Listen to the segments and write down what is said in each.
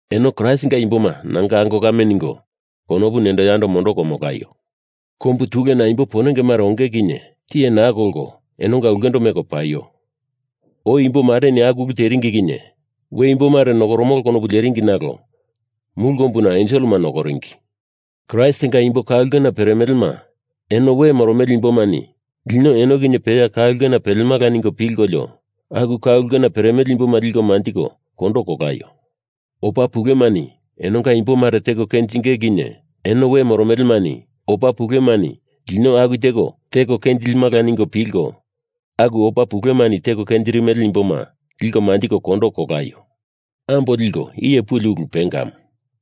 Eno Kraistinga imboma nanga ango kame ningo konopu nendo yando mondoko molaio. Kombu tulena imbo ponenge mare onge kinye tiye naa kolko enonga ulkendo meko paio. Oi imbo mareni aku ulu teringi kinye we imbo mare nokoromolo konopu leringi nalo mulu kombuna enselema nokoringi. Kraistinga imbo ka ulkena peremelema eno we moromele imbomani lino eno kinye peya ka ulkena pelemala ningo pilkolio aku ka ulkena peremele imboma liko manjiko kondo kolaio. Opa pulemani enonga imbo mare teko kenjinge kinye eno we moromelemani opa pulemani lino aku teko teko kenjilimala ningo pilko aku opa pulemani teko kenjirimele imboma liko manjiko kondo kolaio. Ambo liko iye puli ulu pengamu.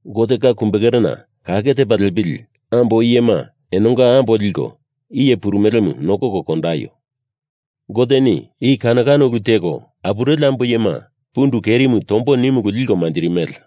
Gotenga kumbekerena kake tepa lepili ambo iyema enonga ambo liko iye purumelemu nokoko kondaio. Goteni i kano kano ulu teko apureli ambo iyema pundu kerimu tombo nimu ulu liko manjirimele.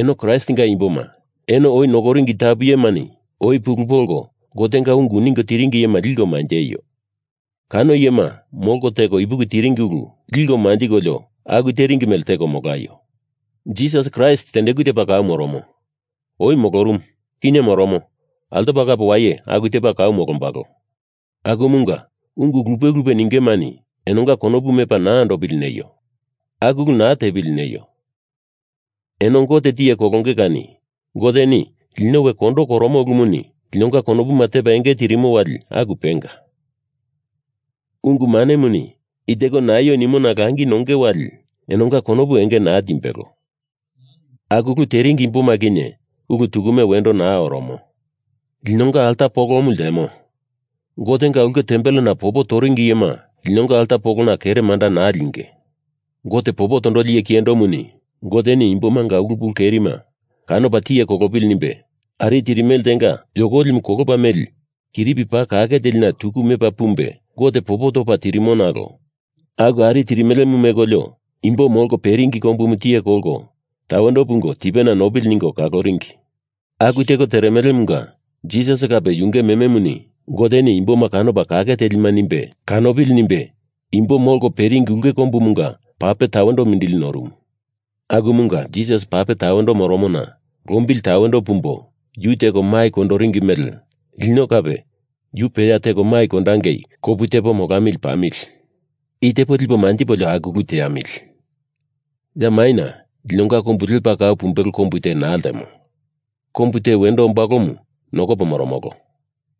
Eno Kraistinga imboma, eno oi nokoringi tapu iyemani oi pulu polko Gotenga ungu ningo tiringi iyema liko manjeio. Kano iyema molko teko ipuki tiringi ulu liko manjikolio aku teringi mele teko molaio. Jisas Kraist tendeku tepa kau moromo. Oi molorumu. Kinye moromo, altopa kape waye aku tepa kau molombalo. Akumunga ungu lupe lupe ningemani enonga konopu mepa naa andopili neio. Aku ulu naa tepili neio. Eno Gote tiye kolonge kani. Goteni lino we kondo koromo ulumuni linonga konopuma tepa enge tirimo wali aku penga. Ungu manemuni i teko naio nimona langi nonge wali enonga konopu enge naa timbelo. Aku ulu teringi imboma kinye ulu tukume wendo naa oromo. Linonga alta polomu ltemo. Gotenga ulke tempelena popo toringi iyema linonga alta polona kere manda naa linge. Gote popo tondoli iye kiyendomuni Goteni imbomanga ulu pulu kerima kanopa tiye kolopili nimbe ari tirimele tenga yokolimu kolopa meli kiripi paa kake telina tuku mepa pumbe Gote popo topa tirimo, nalo aku ari tirmelemu mekolio imbo molko peringi kombumu tiye kolko tawendo pungo tipena nopili ningo kaloringi. Aku teko teremelemunga Jisas kape yunge mememuni Goteni imboma kanopa kake telima nimbe kanopili nimbe imbo molko peringi ulke kombumunga pape tawendo mindili norumu. Akumunga Jisas pape tawendo moromona lombili tawendo pumbo yu teko mai kondoringi mele lino kape yu peya teko mai kondangei kopu tepo molamili pamili. I tepo lipo manjipolio aku ulu teamili. Ya maina linonga kombu lepa kau pumbelo kombu te naa ltemo. Kombu te wendo ombalomu nokopo moromolo.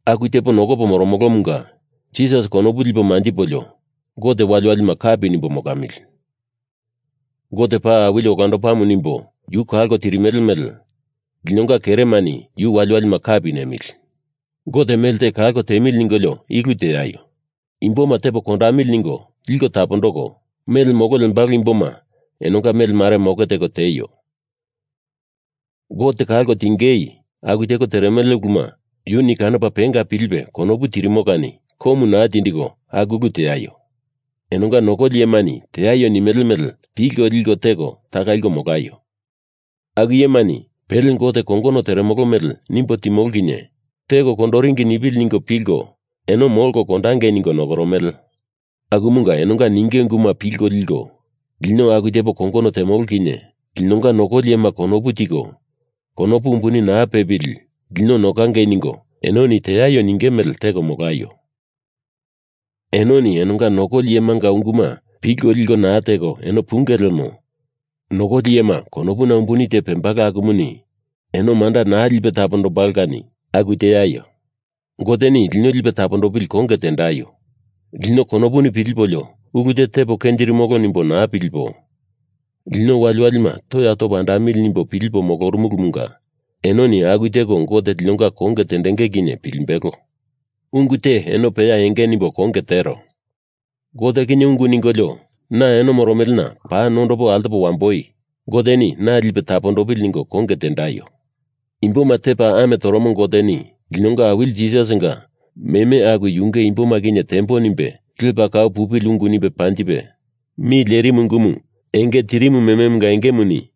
Aku tepo nokopo moromolomunga Jisas konopu lipo manjipolio Gote waliwalima kapi nimbo molamili. Gote paa awili olandopamu nimbo yu kalko tirimele mele linonga keremani yu waliwalima kapi nemili. Gote mele te kalko tiemili ningolio i ulu teaio. Imboma tepo kondamili ningo liko tapondoko, mele molo lembalo imboma enonga mele mare moke teko tieio. Gote kalko tiengei aku teko teremele uluma yuni kanopa penga pilipe konopu tirimo kani komu naa tindiko aku ulu teaio. Enonga nokoli iyemani teaio nimele mele pilko liko teko taka liko molaio. Aku iyemani pele Gote kongono teremolo mele nimbo timolo kinye teko kondoringi nipili ningo pilko eno molko kondangei ningo nokoromele. Akumunga enonga ninge unguma pilko liko, lino aku tepo kongono temolo kinye linonga nokoli iyema konopu tiko konopu umbuni naa pepili lino nokangei ningo enoni teaio ninge mele teko molaio. Enoni enonga nokoli iyemanga unguma pilko liko naa teko eno punge lemo nokoli iyema konopuna umbuni te pembalo akumuni eno manda naa lipe tapondombalo kani aku teaio. Goteni lino lipe tapondopili konge tendaio. Lino konopuni pilipolio ulu te tepo kenjirimolo nimbo naa pilipo, lino waliwalima toya topo andamili nimbo pilipo moromolomunga enoni aku teko Gote linonga konge tendenge kinye pilimbelo. Ungu te eno peya enge nimbo konge tero. Gote kinye ungu ningolio na eno moromelena paa nondopo altopo wamboi Goteni na lipe tapondopili ningo konge tendaio. Imboma tepa ame toromo Goteni linonga Awili Jisasinga meme aku yunge imboma kinye tembo nimbe lepa kau pupili ungu nimbe panjipe mi lerimu ungumu enge tirimu mememunga engemuni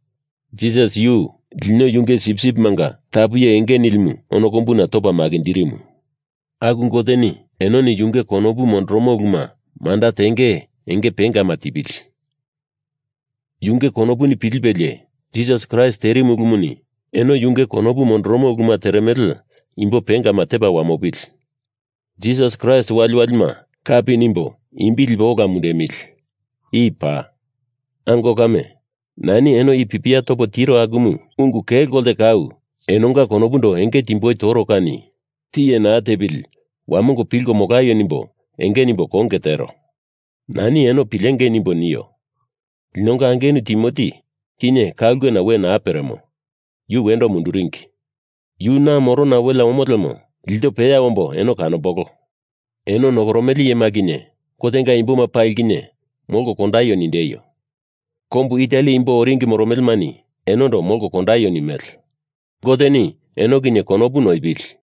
Jisas yu lino yunge sipsipimanga tapu iye enge nilimu ono kombuna topa makinjirimu. Aku Goteni enoni yunge konopu mondoromo uluma manda tengei enge paa pengama tipili. Yunge konopuni pilipelie Jisas Kraist terimu ulumuni eno yunge konopu mondoromo uluma teremele imbo pengama tepa wamopili. Jisas Kraist waliwalima kapi nimbo imbi lipo ola mundemili. I paa. Ango kame, nani eno i pipia topo tiro akumu ungu kelo kolte kau enonga konopundo enge timboi toro kani tiye naa tepili wamongo pilko molaio nimbo enge nimbo konge tero. Nani eno pilengei nimbo nio. Linonga angenu Timoti kinye ka ulkena we naa peremo, yu wendo munduringi. Yu na morona welea omo lemo ilto peya ombo eno kanombolo. Eno nokoromele iyema kinye Gotenga imboma pali kinye molko kondaio nindeio. Kombu Itali imbo oringi moromelemani enondo molko kondaio nimele. Goteni eno kinye konopu noipili.